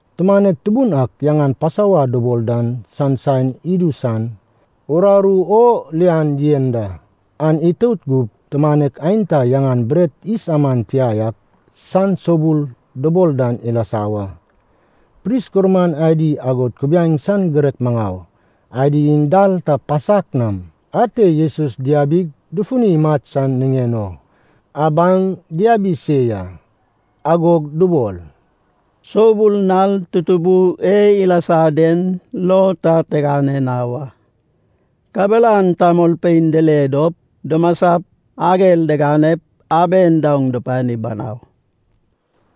Tumanek tubun ak yaŋan Pasova dubol dan san saen idu san, nal uraru o lian yen da. An itout gup, tumanek aenta yaŋan Bret Yis Aman Tia ak San Soubul dubol dan ilasa wa. Pris gurman adi agod kubiaeŋ san girek maŋau adi iŋ dal ta pasak nam ate Jesus diabip dufuni imat san niŋen o abaŋ diabi se ya. Agog dubol, “Soubul nal tutubu e ilasa den lo ta tigane na wa, kabelan tamolpein dile dop dumasap ager diganep aben daoŋ dupani banau.”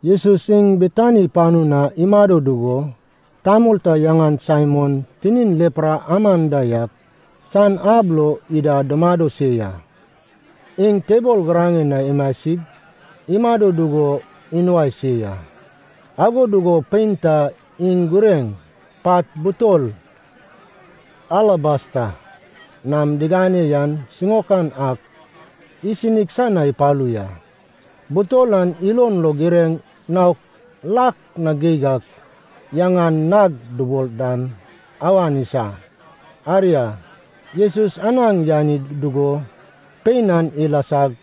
Jesus iŋ Betani panu na imado dugo, tamol ta yaŋan Saimon tinin lepra aman da yak san ab lo ida dumado se ya. Iŋ tebol giraŋen na imasig imado dugo inuai se ya. Ago dugo pein ta iŋ gureŋ, pat butol alabasta nam digane yan siŋaokan ak, isinig san na ipalu ya. Butol an ilon lo gureŋ naon lak na geig ak, yaŋan nard dubol dan, awan isa. Aria, Jesus anaŋ yani dugo pein an ilasag,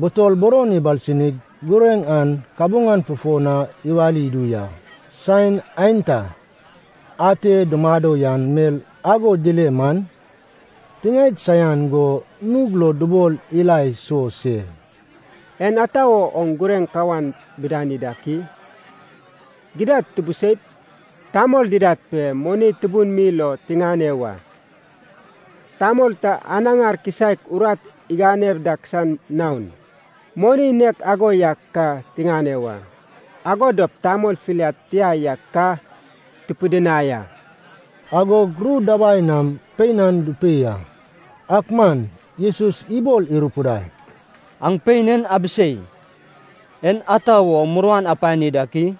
butol buron ibalsinig gureŋ an kabuŋan fufo na iwali idu ya. Saen aenta ate dumado yan mel ago dile man, tiŋaed saian go nug lo dubol ila iso se, “En ata wo oŋ gureŋ kawan bidani dak i? Gidad tubuseip, tamol didad pe moni tubun mi lo tiŋane wa. Tamol ta anaŋar kisaek urat igane dak san naon, moni nek ago yak ka tiŋane wa. Ago dop tamol filiad tia yak ka tupidinai a.” Agog ru dabai nam pein an dupei a. Ak man Jesus ibol irupidai, “Aŋ pein en abisei! En ata wo muruan apani dak i?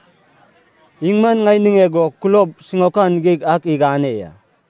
Iŋ man ŋai niŋeg o kulob siŋaokan geig ak igane ya.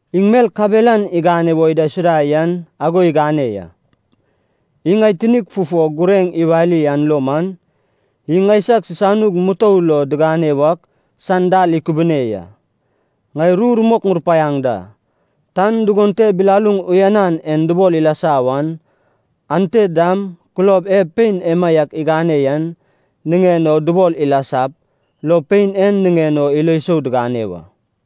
Iŋ mel kabelan igane wo idaisuda yan ago igane ya. Iŋ ŋai tinig fufo gureŋ iwali an lo man, iŋ ŋaisag sisanug mutou lo digane wak san dal ikubune ya. Ŋai ru rumok ŋurupaiaŋ da. Tan dugon te bilaluŋ uyanan en dubol ilasa wan, ante dam kulob e pein emaiak igane yen niŋen o dubol ilasap, lo pein en niŋen o ilo sou digane wa.”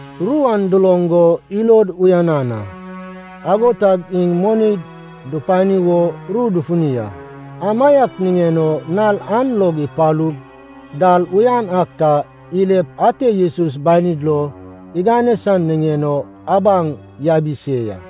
Ru an duloŋ go ilod uyanan a, ago tag iŋ moni dupani wo ru dufuni a. Amaiak niŋen o nal an log ipalu, dal uyan ak ta ilep ate Jesus banid lo igane san niŋen o abaŋ yabi se ya.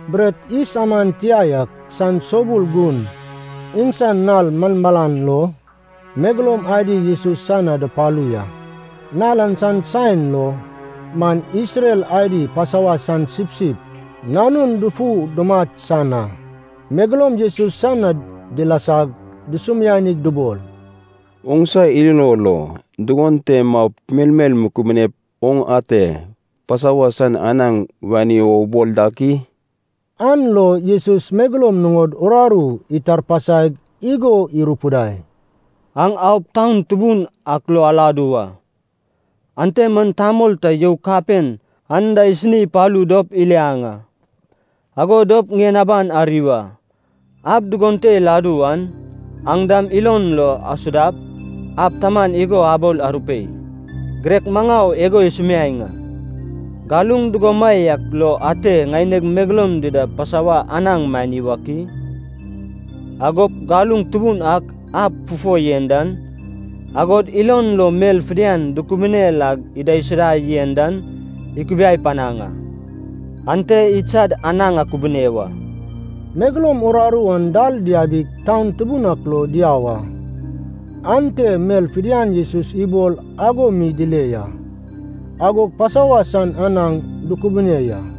Bret yis aman tia yak san soubul gun, iŋsan nal malmalan lo, megeloum adi Jesus san na dupalu ya. Nal an san saen lo man Isrel adi Pasova san sipsip nanun dufu dumat san a. Megeloum Jesus san na dilasag dusumianig dubol, “Oŋsa ilo lo, dugon te maup melmel mukubinep oŋ ate Pasova san anaŋ wani wo ubol dak i?” An lo Jesus megeloum nuŋod uraru itarpasaig igo irupidai, “Aŋ aup taun tubun ak lo aladu wa. Ante man tamol ta you kapen anda isini ipalu dop iliaŋ a. Ago dop ŋien aban ari wa. Ab dugon te iladu wan, aŋ dam ilon lo asudap, ab taman igo abol arupei, ‘Girek Maŋau igo isumiaeŋ a, galuŋ dugomaiak lo, ate ŋaineg megeloum dida Pasova anaŋ mani wak i?’ Agop galuŋ tubun a ab fufo yen dan, agod ilon lo mel fidian dukubune lag idaisuda yen dan ikubiai panaŋ a. Ante idsad anaŋ akubune wa.” Megeloum uraru an dal diabig taun tubun ak lo diau a. Ante mel fidian Jesus ibol ago mi dile ya, agog Pasova san anaŋ dukubune ya.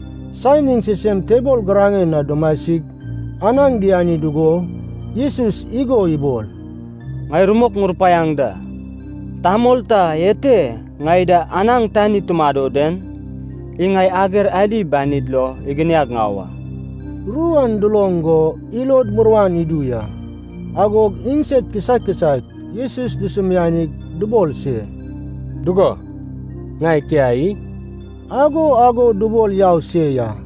Saen iŋ sisem tebol giraŋen na dumasig anaŋ diani dugo, Jesus igo ibol, “Ŋai rumok ŋurupaiaŋ da, tamol ta ete ŋai da anaŋ tani tumado den, iŋ ŋai ager adi banid lo iginiag ŋau a.” Ru an duloŋ go ilod muruan idu ya. Agog iŋsed kisaek kisaek Jesus dusumianig dubol se, “Dugo ŋai tia i?” Ago ago dubol yau se ya.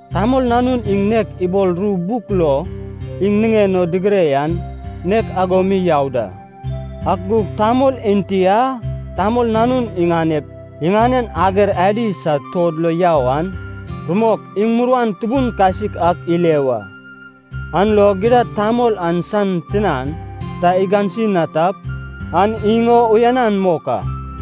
Tamol Nanun iŋ nek ibol ru buk lo iŋ niŋen o digire an, nek ago mi yau da. Ak gug tamol enti a Tamol Nanun iganep iŋanen ager adi sad tuod lo yau an, rumok iŋ muruan tubun kasik ak ile wa! An lo gidad tamol an san tinan ta igansi na tap, an iŋ o uyanan mok a.”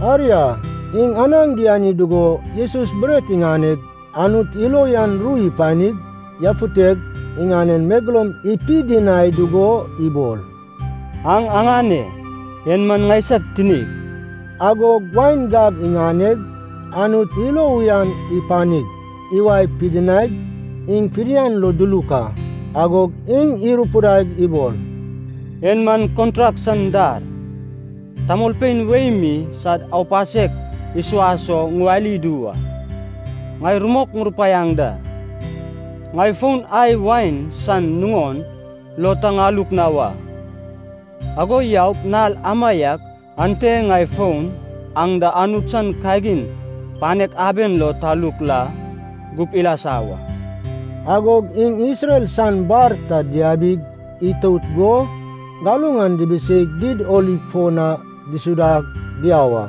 Aria, iŋ anaŋ diani dugo Jesus bret iŋaneg, Anut ilo uyan ru ipanig yafuteg, iŋanen megeloum ipidinai dugo ibol, “Aŋ aŋane, en man ŋaisag tinig.” Agog wain gab iŋaneg, Anut ilo uyan ipanig, iwae pidinaig, iŋ fidian lo duluk a. Agog iŋ irupidaig ibol, “En man kontrak san dar, tamolpein wei mi sad aupasek isuas o ŋuwali idu wa. Ŋai rumok ŋurupaiaŋ da, ŋai fon ai wain san nuŋon lo ta ŋaluk na wa, ago yaup nal amaiak ante ŋai fon aŋ da Anut san kagin panek aben lo taluk la gup ilasa wa.” Agog iŋ Isrel san bar ta diabig itout go galuŋ an dibiseig Did Oliv fo na disuda diau a.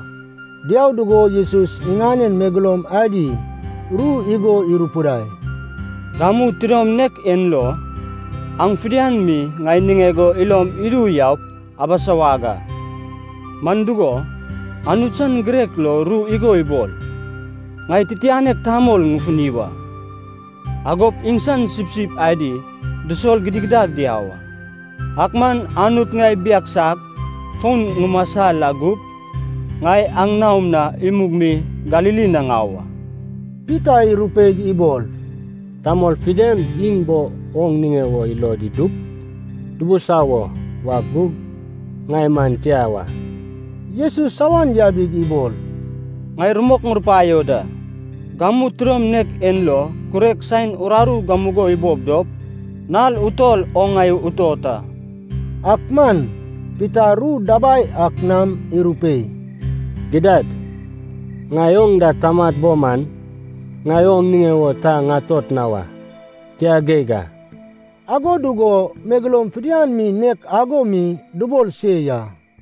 Diau dugo Jesus iŋanen megeloum adi ru igo irupidai, “Gamu tidom nek en lo, aŋ fidian mi ŋai niŋeg o ilom idu yaup abisawag a. Man dugo, Anut san girek lo ru igo ibol, ‘Ŋai titianek tamol ŋufuni wa, agop iŋsan sipsip adi dusol gidigidad diau a.’ Ak man Anut ŋai ibiagsap fon ŋumasa la gup, ŋai aŋ naom na imug mi Galili na ŋau a.” Pita irupeig ibol, “Tamol fidian iŋ bo oŋ niŋe wo ilod idup dubusawo wak gug, ŋai man tia wa!” Jesus awan yabig ibol, “Ŋai rumok ŋurupaio da, gamu tidom nek en lo kurek saen uraru gamugo ibob dop, nal utol oŋ ŋai utot a.” Ak man Pita ru dabai ak nam irupei, “Gidad, ŋai oŋ da tamat bo man, ŋai oŋ niŋe wo ta ŋatot na wa, tia geig a!” Ago dugo megeloum fidian mi nek ago mi dubol se ya.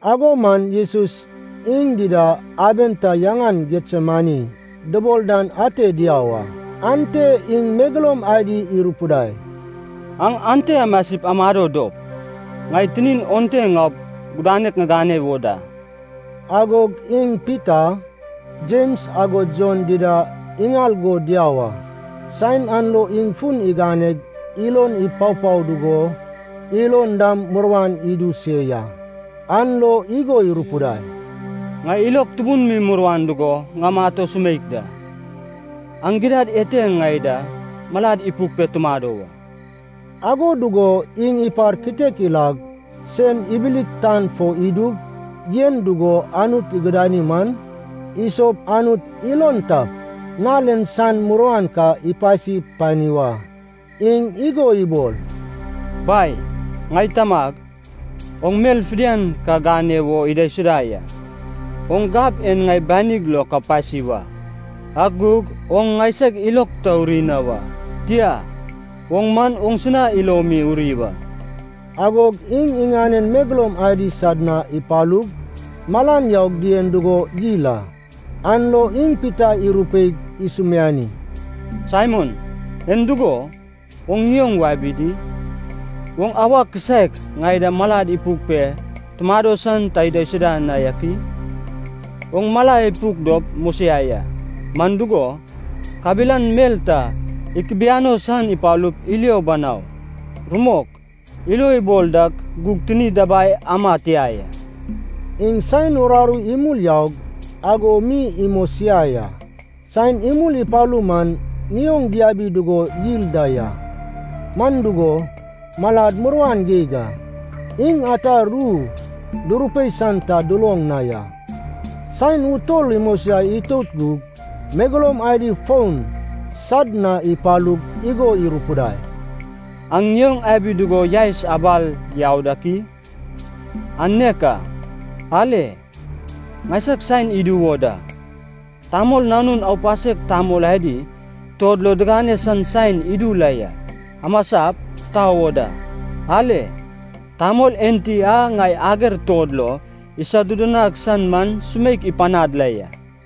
Ago man Jesus iŋ dida, aben ta yaŋan Getsemani dubol dan ate diau a. Ante iŋ megeloum adi irupidai, “Aŋ ente amasip amado dop, ŋai titin onte ŋaup gudanek ŋigane wo da.” Agog iŋ Pita, Jems agod Jon dida iŋal go diau a. Saen an lo iŋ fun iganeg ilon ipapao dugo ilon dam muruan idu se ya. An lo igo irupidai, “Ŋai ilog tubun mi muruan dugo ŋamat o sumeik da. Aŋ gidad ete ŋai da malad ipuk pe tumado wa.” Ago dugo iŋ ipar kitek ilag, sen ibilig tan fo idug yen dugo Anut igudani man, isop Anut ilon tap, nal en san muruan ka ipasi pani wa. Iŋ igo ibol, “Bai, ŋai Tamag, oŋ mel fidian ka gane wo idaisuda ya. Oŋ gab en ŋai banig lo ka pasi wa. Ak gug oŋ ŋaisag ilog ta uri na wa, tia, oŋ man oŋsina ilo mi uri wa.” Agog iŋ iŋanen megeloum adi sad na ipalug, malan yaug dien dugo yil a. An lo iŋ Pita irupeig isumiani, “Saimon, en dugo, oŋ ŋioŋ wabi di? Oŋ auwa kisaek ŋai da malad ipuk pe tumado san ta idaisuda na yak i? Oŋ mala ipuk dop mosiai a, man dugo, kabelan mel ta ikubiano san ipalup ilio banau. Rumok, ilo ibol dak gug tini dabai ama tia ya.” Iŋ saen uraru imul yaug ago mi imosiai a. Saen imul ipalu man ŋioŋ diabi dugo yil da ya, man dugo, malad muruan geig a. Iŋ ata ru durupei san ta duloŋ na ya. Saen utol imosiai itout gug, megeloum adi fon sad na ipalug igo irupidai, “Aŋ ŋioŋ abi dugo yaes abal yau dak i? An nek a! Ale, ŋaisag saen idu wo da, Tamol Nanun aupasek tamol adi tuod lo digane san saen idu la ya. Amasap, tau o da. Ale, tamol enti a ŋai ager tuod lo isodudunag san man sumeik ipanad la ya!”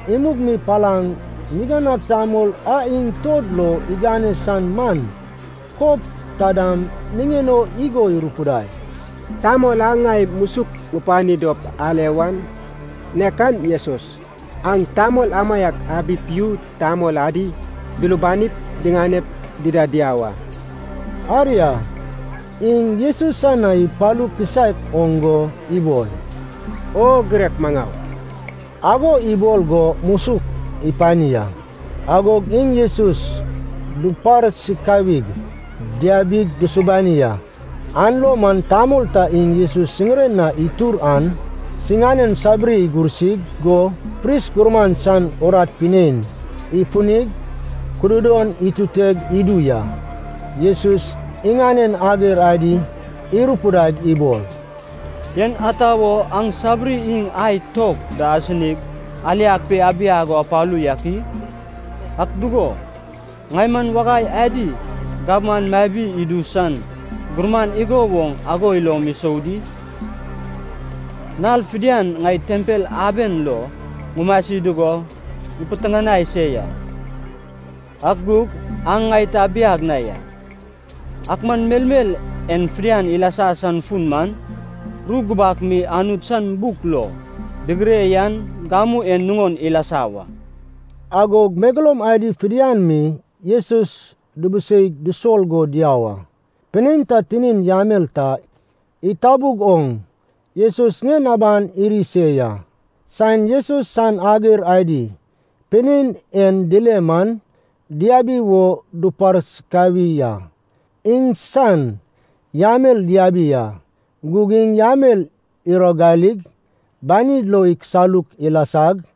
Imug mi palaŋ niganag tamol a iŋ tuod lo igane san man, kob ta dam niŋen o igo irupidai, “Tamol a ŋai musuk ŋupani dop ale wan, nek an Jesus, aŋ tamol amaiak abip yu tamol adi dulubanip diŋanep dida diau a.” Aria, iŋ Jesus san na ipalu kisaek oŋ go ibol, “O girek maŋau” Ago ibol go musuk ipani a. Agog iŋ Jesus duparsikawig diabig dusubani a. An lo man tamol ta iŋ Jesus siŋiren na itur an, sinan sabiri igursi go pris gurman san urat pinein ifunig, kududon ituteg idu ya. Jesus iŋanen ager adi irupidaig ibol, “En ata wo aŋ sabiri iŋ ai tok da asinig aliag pe abiag o apalu yak i? Ak dugo, ŋai man wagai adi gabman mabi idu san gurman igo woŋ ago ilom isou di? Nal fidian ŋai tempel aben lo ŋumasi dugo ŋupiteŋanai se ya, ak gug aŋ ŋai ta abiag na ya. Ak man melmel en fidian ilasa san fun man, ru gubak mi Anut san buk lo digire yan gamu en nuŋon ilasa wa.” Agog megeloum adi fidian mi Jesus dubuseig dusol go diau a. Pinein ta, tinin yamel ta itabug oŋ, Jesus ŋien aban iri se ya. Saen Jesus san ager adi pinein en dile man, diabi wo duparsikawi a. Iŋsan yamel diabi a, gug iŋ yamel iragalig, banid lo ikisaluk ilasag,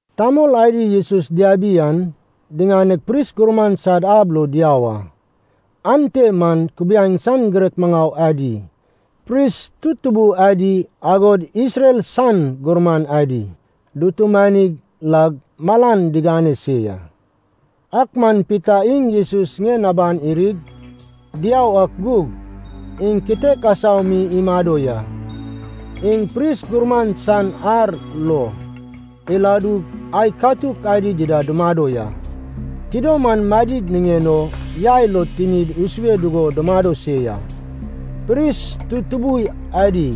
Tamol adi Jesus diabi an, diŋaneg pris gurman san ab lo diau a. Ante man kubiaeŋ san girek maŋau adi, pris tutubui adi agod Isrel san gurman adi dutumani lag malan digane se ya. Ak man Pita iŋ Jesus ŋien aban irig diau ak gug, iŋ kitek asau mi imado ya. Iŋ pris gurman san ar lo iladug ai katuk adi dida dumado ya. Tidom an madid niŋen o yai lo tinid isue dugo dumado se ya. Pris tutubui adi,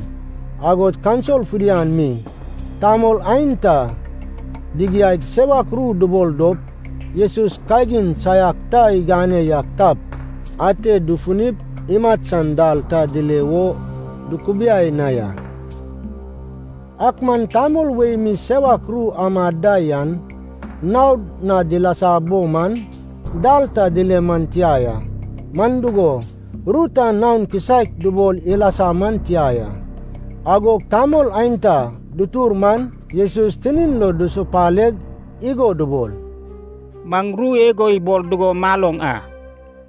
agod kaunsil fidian mi, tamol aenta digiaig sewak ru dubol dop, Jesus kagin saiak ta igane yak tap, ate dufunip imat san dal ta dile wo dukubiai na ya. Ak man tamol wei mi sewak ru amad da yan naod na dilasa bo man, dal ta dile man tia ya, man dugo, ru ta naon kisaek dubol ilasa man tia ya. Agog tamol aenta dutur man Jesus tinin lo dusupaleg igo dubol, “Maŋ ru igo ibol dugo maloŋ a.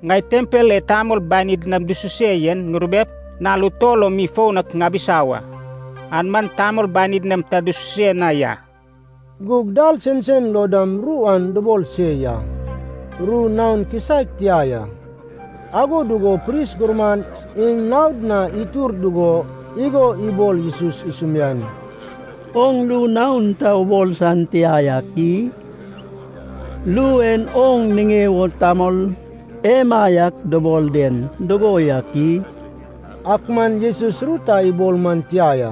‘Ŋai tempel e tamol banid nam dususe yen ŋurubep, nal utol lo mi foun ak ŋabisa wa, an man tamol banid nam ta dususe na ya.’” Gug dal sensen lo dam ru an dubol se ya, ru naon kisaek tia ya. Ago dugo pris gurman iŋ naod na itur dugo igo ibol Jesus isumiani, “Oŋ ru naon ta ubol san tia yak i? Ru e oŋ niŋe wo tamol emaiak dubol den dugo yak i?” Ak man Jesus ru ta ibol man tia ya,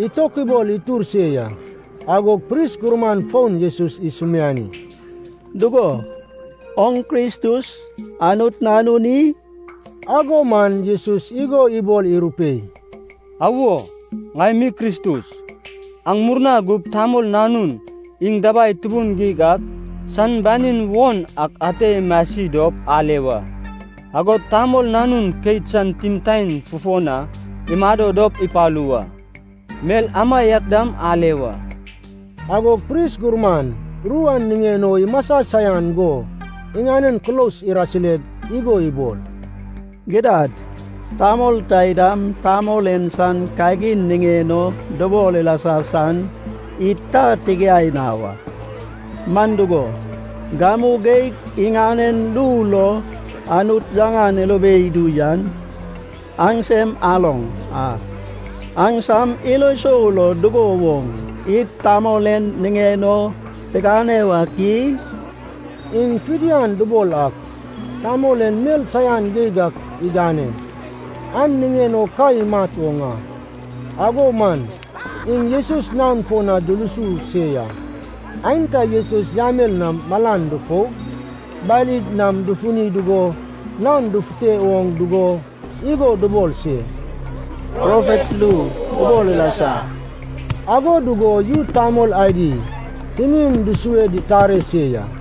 itokubol itur se ya. Agog pris gurman fon Jesus isumiani, “Dugo, oŋ Kristus, Anut Nanun i?” Ago man Jesus igo ibol irupei, “Awo, ŋai mi Kristus. Aŋ murna gup Tamol Nanun iŋ Dabai Tubun Geig ak san banin won ak ate imasi dop ale wa. Agod Tamol Nanun keit san timtaen fufo na imado dop ipalu wa, mel amaiak dam ale wa.” Agog pris gurman, ru an niŋen o imasa saian go iŋanen kulos irasireg igo ibol, “Gidad, tamol taidam, tamol en san kagin niŋen o dubol ilasa san id ta tigiai na wa. Man dugo, gamu geig iŋanen ru lo Anut yaŋan irube idu yan aŋsem aloŋ a. Aŋsam ilo sou lo, dugo woŋ id tamol en niŋen o tigane wak i?” Iŋ fidian dubol ak, tamol en mel saian geig ak igane, an niŋen o ka imat oŋ a. Ago man iŋ Jesus naon fo na dulusu se ya. Aenta Jesus yamel nam malan dufoug banid nam dufuni dugo naon dugufute oŋ dugo igo dubol se, “Profet ru ubol ilasa!” Ago dugo yu tamol adi tinin dusue ditare se ya.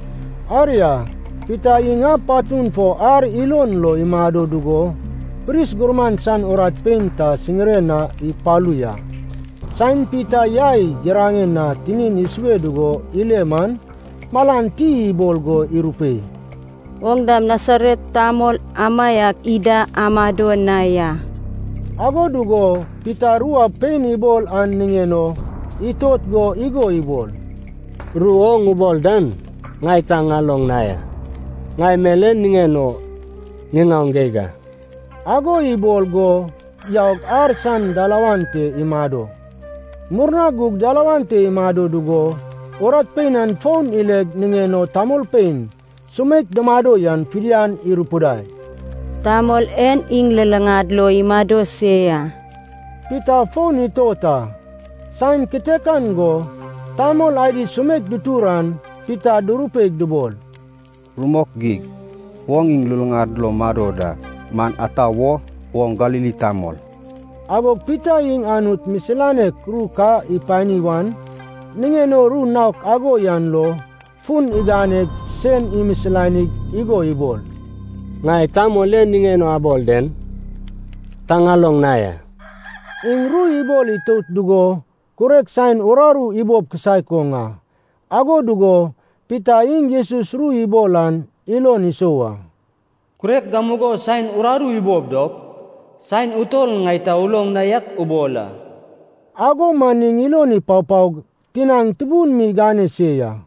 Aria, Pita iŋ ab patun fo ar ilon lo imado dugo, pris gurman san urat pein ta siŋiren na ipalu ya. Saen Pita yai giraŋen na tinin isue dugo ile man, malan ti ibol go irupei, “Oŋ dam Nasaret tamol amaiak ida amado na ya.” Ago dugo Pita ru a pein ibol an niŋen o itot go igo ibol, “Ru oŋ ubol dan ŋai ta ŋaloŋ na ya, ŋai mel en niŋen o ŋiŋaoŋ geig a.” Ago ibol go yaug ar san dalawan te imado. Murna gug dalawan te imado dugo, urat pein an fon ileg niŋen o tamolpein sumeik dumado yan fidian irupidai, “Tamol en iŋ luluŋad lo imado se ya.” Pita fon itot a. Saen kitekan go tamol adi sumeik dutur an Pita durupeig dubol, “Rumok geig, oŋ iŋ luluŋad lo mado da, man ata wo, oŋ Galili tamol.” Agog Pita iŋ Anut misilanek ru ka ipani wan niŋen o ru naok ago yan lo, fun iganeg sen imisilanig igo ibol, “Ŋai tamol en niŋen o abol den ta ŋaloŋ na ya.” Iŋ ru ibol itout dugo, kurek saen uraru ibob kisaek oŋ a. Ago dugo Pita iŋ Jesus ru ibol an ilon isou a, “Kurek gamugo saen uraru ibob dop, saen utol ŋai ta uloŋ na yak ubol a.” Ago man iŋ ilon ipapaog tinaŋ tubun mi igane se ya.